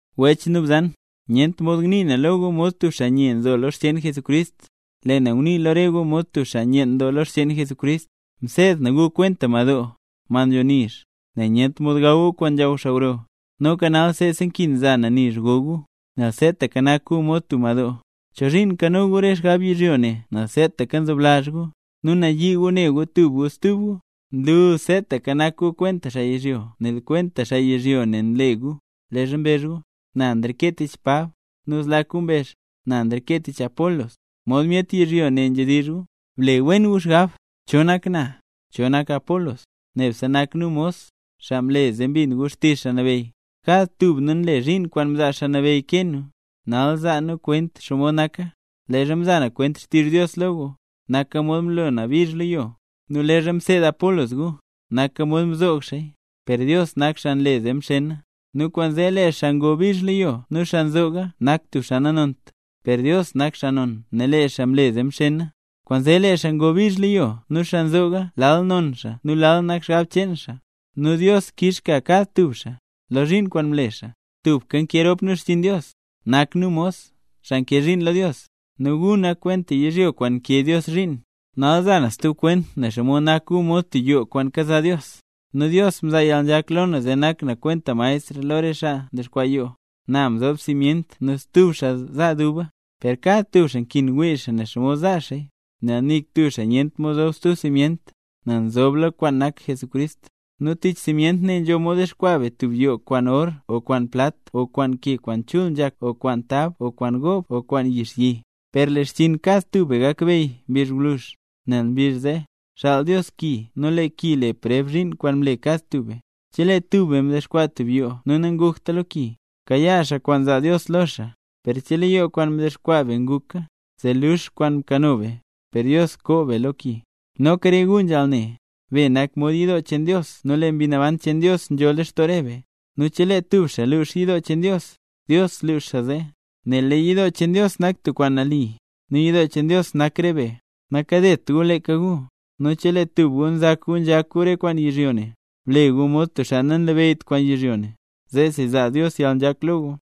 Wech nu bzan, nyent mod ngnii na lo gu mod tub xaa nye nzo lo re xcheen Jesucrist, lee na ngunii lo re gu mod tub xaa nyeen doo lo xcheen Jesucrist. Mseed na gu kwenta madoo, mad nzho nizh, nel nyent mod gaw gu kwaan nzhaw xaa gro. Noka nal seesa nkin za na nizh go gu, nel seetaka nak gu mod tub madoo. ¿Chozhiin nkano gu re xgab yizhyo ne nel seetaka nzoblazh gu, nu nayii gu ne gu tub gu stub gu? Nlu seetaka nak gu kwenta xaa yizhyo ne nel kwenta xaa yizhyo ne nle gu, leezha mbezh gu: “Na nreke tich Pab”, nu zlak gu mbezh: “Na nreke tich Apolos”, mod myet yizhyo ne nzhedizh gu. Ble wen gu xgab, ¿cho nak na?, ¿cho nak Apolos? Nebse nak nu mos, xaa mle zee mbin gu xtizh Xaa Nabeyy. Kad tub nu nle zhiin kwaan mzaa Xaa Nabeyy kee nu. Nal za na kwent xomod naka; leezha mza na kwent xtizh Dios lo gu, naka mod mlo na bizh lo yo; nu leezha mseed Apolos gu, naka mod mzoog xaaya, per Dios nak xaa nle zee mxena. Nu kwaanzee lee xaa ngo bizh lo yo nu xaa nzooga nak tub xaa nanont, per Dios nak xaa non nel lee xaa mle zee mxena. Kwaanzee lee xaa ngo bizh lo yo nu xaa nzooga lal non xaa nu lal nak xgab cheen xaa, nu Dios kix kad lo tub xaa, lo zhiin kwaan mle xaa. Tubka nkee rop nu xchiin Dios. Nak nu mos, xaa nkee zhiin lo Dios, nu gu nak kwenta yizhyo kwaan nkee Dios zhiin. Nal za na stub kwent nen xomod nak gu mod tub yoo kwaan kaza Dios. Nu Dios mzaa yalnzhak lo na zee nak na kwenta maestr lo re xaa ndexkwaa yoo. Na mzob simyent nu stub xaa za duba. Per kad tub xaa nkin wii xaa nen xomod za xaaya, nel nik tub xaa nyent mod zob stub simyent, nel nzobla kwaan nak Jesucrist. Nu tich simyent ne nzho mod dexkwaa be tub yoo kwaan or o kwaan plat o kwaan ke kwaan chul nzhak o kwaan tab o kwaan goob o kwaan yixyi; per lee xchiin kad tub be gakbeyy mbizh gwluzh; nel mbizh zee, xaal Dios ki nu lee ki le preb zhiin kwaan mle kad tub be. Chelee tub be mdexkwaa tub yoo nu nangukta lo ki, kayaa xaa kwaan zaa Dios lo xaa. Per chelee yoo kwaan mdexkwaa be nguka, zee luux kwaan mkano be, per Dios koo be lo ki. Noka re gu nzhaal ne, be nak mod yidoo cheen Dios nu lee Mbi Naban cheen Dios nzho lextoo re be. Nu chelee tub xaa lux yidoo cheen Dios, Dios lux xaa zee, nel lee yidoo cheen Dios nak tub kwaan nali, nu yidoo cheen Dios nak re be. Nakadet gu leeka gu; nu chelee tub gu nzak gu nzhak gu re kwaan yizhyo ne, ble gu mod tub xaa nanlabeyyt kwaan yizhyo ne, zeesi zaa Dios yalnzhak lo gu.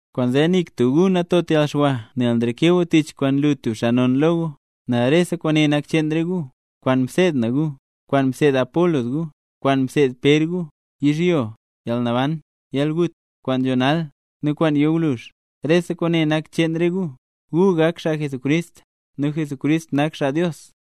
Kwaanzee nik tub gu natot yalxwa nel nreke gu tich kwaan nlu tub xaa non lo gu, nel rese kwaane nak cheen re gu: kwaan mseed na gu, kwaan mseed Apolos gu, kwaan mseed Pér gu, yizhyo, yalnaban, yalgut, kwaan nzho nal, nu kwaan yo gwluzh, rese kwaane nak cheen re gu, gu nak xaa Jesucrist, nu Jesucrist nak xaa Dios.